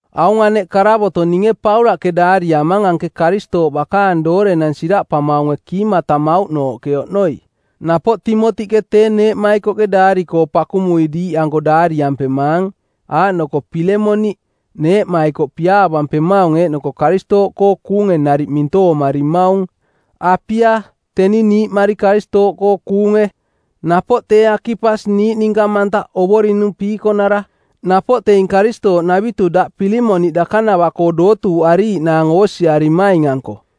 Aung aneꞌ karavoto˜ ninge Paulaꞌke daariamang anke Karistooꞌ bakaang doorenang siraꞌpamaunge kiimatamauꞌnooꞌke oꞌnoi. Napoꞌ Timotiꞌke tee neeꞌmaikoꞌke daari-koo pakumui diiꞌanko daariampemaang, aaꞌnoko Pilemoni, neeꞌmaikoꞌ piaavampemaung eeꞌnoko Karistooꞌkoo kuunge nariꞌ mintoomarimaung; Apia, teni niiꞌmari Karistooꞌkoo kuunge; napoꞌ tee Akipas niiꞌ ninka mantaꞌ Ovorinung piikonara; napoꞌ teing Karistooꞌnavitu daꞌ Pilemoni dakanava-koo dootuuꞌariiꞌnaang oosiarimaing-anko.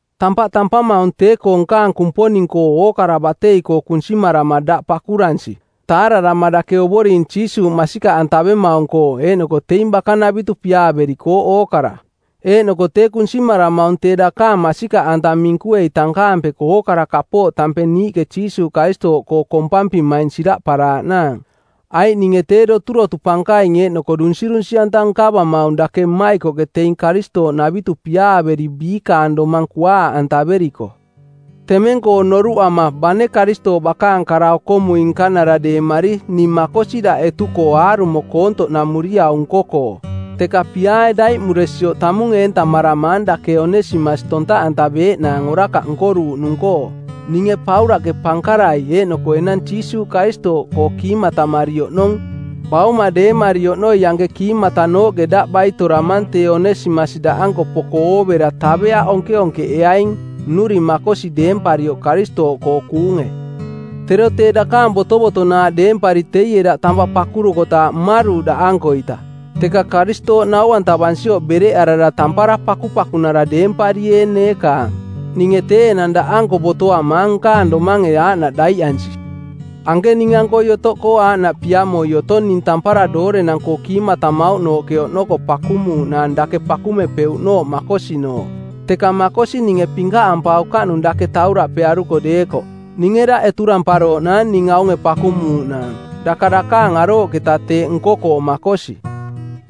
Tampaꞌ tampamaung tee-koo nkaang Kumponing-koo ookara batei-koo kunsimarama daꞌ pakuransi, taararama dake Ovoring Jiisuuꞌ masikaꞌantavemaung-koo eeꞌnoko teing bakanavitu piaaverikooꞌ ookara. Eeꞌnoko tee kunsimaramaung tee dakaang masikaꞌanta minkuei tankaampeko ookara kapooꞌ tampeng niiꞌke Jiisuuꞌ Karistooꞌ koo kompampimaing siraꞌparaaꞌnaang. Aiꞌ ninge tee doturotu pankaing eeꞌnoko dunsirunsi˜anta nkavamaung dake mmaikoꞌke teing Karistooꞌnavitu piaaveri biikaang domang kuaaꞌantaveriko. Temeng-koo noruꞌama, bane Karistooꞌ bakaang kara-okomui-nkanara deemari ning makosi daꞌ etu-koo aarumo koontoꞌnamuriau nko-koo; Teka piaae daiꞌmuresioꞌ tamung eentaramang dake Onesimas tontaꞌantaveeꞌnaang orakaꞌ nkoruuꞌnung-koo; Ninge Paulaꞌke pankarai eeꞌnoko enang Jiisuuꞌ Karistooꞌkoo kiimatamari oꞌnong, bauma deemari oꞌnoi anke kiimatanooꞌke daꞌ baitoramang tee Onesimas daꞌanko poko oovera taveaꞌ onkeonkeꞌeaing, nnuring makosi deemparioꞌ Karistooꞌkoo kuunge. Tero tee dakaang botovotonaaꞌ deempari teie daꞌ tampaꞌ pakuruarukotaaꞌ mmaruuꞌ daꞌankoita, teka Karistooꞌ nau-antavansioꞌ bereꞌarara tampara pakupakunara deemparieeng neekaang. Ninge tee enang daꞌanko botoamaang nkaang domange aaꞌnaꞌ daiꞌansi. Anke ning-ankoi otoꞌkoo aaꞌnaꞌ piamoi otong ning tampara doorenang-koo kiimatamauꞌ nooꞌke oꞌnoko pakumuuꞌnaang dake pakumepeuꞌnooꞌ makosinooꞌ. Teka makosi ninge pinkaꞌampaukaꞌnung dake tauraꞌpearuko deekoꞌ. Ninge daꞌ eturamparooꞌnaang ning aunge pakumuuꞌnaang, daka dakaang arooꞌketa teeꞌ nko-koo makosi.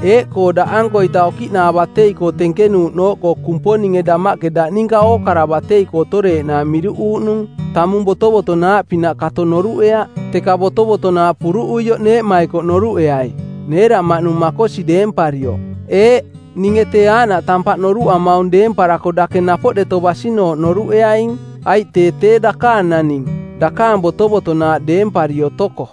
Eeꞌkoo daꞌankoita okiꞌnaa batei-koo tenkenuuꞌnooꞌkoo Kumponinge damaꞌke daꞌ ninka ookara batei-koo otoreeꞌnaang miruꞌ uuꞌnung, tamung botovotonaaꞌpinaꞌ kato noruꞌeaꞌ, teka botovotonaaꞌ puruꞌuioꞌ neeꞌmaikoꞌ noruꞌeai, neeraꞌmaꞌnung makosi deemparioꞌ. Eeꞌ, ninge tee aaꞌnaꞌ tampaꞌ noruꞌamaung deemparako dake napoꞌ deto basinooꞌ noruꞌeaing, aiꞌ tee tee dakaang naning, dakaang botovotonaaꞌ deempari otoko.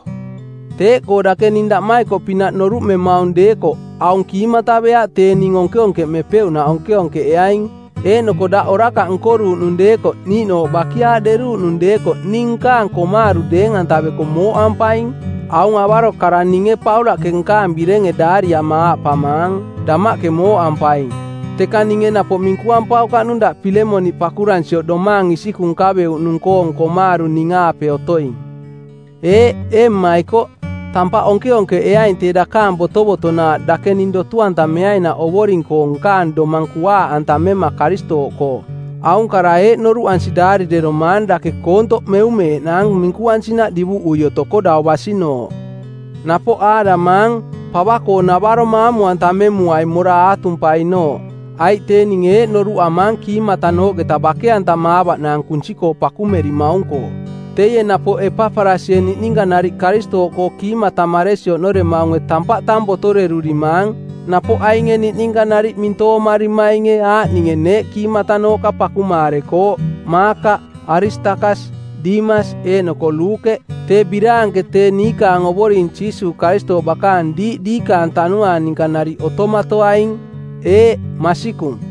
Teeꞌkoo dake ning daꞌmaikoꞌpinaꞌ noruꞌmemaung deekoꞌ, aung kiimataveaꞌ tee ning onkeonkeꞌmepeuꞌnaꞌ onkeonkeꞌeaing. Eeꞌnoko daꞌ orakaꞌ nkoruuꞌnung deekoꞌ niiꞌnooꞌ bakiaaꞌderuuꞌnung deekoꞌ ning nkaang komaaru˜ deeng-antaveko mooꞌampaing. Aung avaro kara ninge Paulaꞌke nkaang birenge daariama aaꞌpamaang, “Damaꞌke mooꞌampaing,” teka ninge napoꞌ minkuampaukaꞌnung daꞌ Pilemoni pakuransioꞌ domaang isikung nkaveuꞌnung-koong komaaru ning-aape otoing. Eeꞌ, ee mmaikoꞌ, tampaꞌ onkeonkeꞌeaing tee dakaang botovotonaaꞌ dake ning dotu-antameainaꞌ Ovoring-koo nkaang domang kuaaꞌantamema Karistooꞌkoo. Aung kara eeꞌ noruꞌansi daarireromaang dake koontoꞌ meumeeꞌnaang minkuansinaꞌ divuꞌui otoko dau basinooꞌ. Napoꞌ aaꞌdamaang, “Pava-koo-navaro maamu-antamemuai mora aatumpainooꞌ, aiꞌ tee ninge eeꞌ noruꞌamaang kiimatanooꞌketa bake-antamaavaꞌnaang kunsi-koo pakumerimaung-koo. Teie napoꞌ Epaparasie niꞌninka nariꞌ Karistooꞌkoo kiimatamaresi oꞌnoremaunge tampaꞌ tang botorerurimaang, napoꞌ ainge niꞌninka nariꞌ mintoomarimaing aaꞌninge neeꞌ kiimatanooꞌka pakumaarekooꞌ: Maakaꞌ, Aristakas, Dimas, eeꞌnoko Luukeꞌ. Tee biraanke tee niikaang Ovoring Jiisuuꞌ Karistooꞌ bakaang diiꞌ diikaang tanuaang ninka nariꞌ otomatoaing. Eeꞌ, Masikung.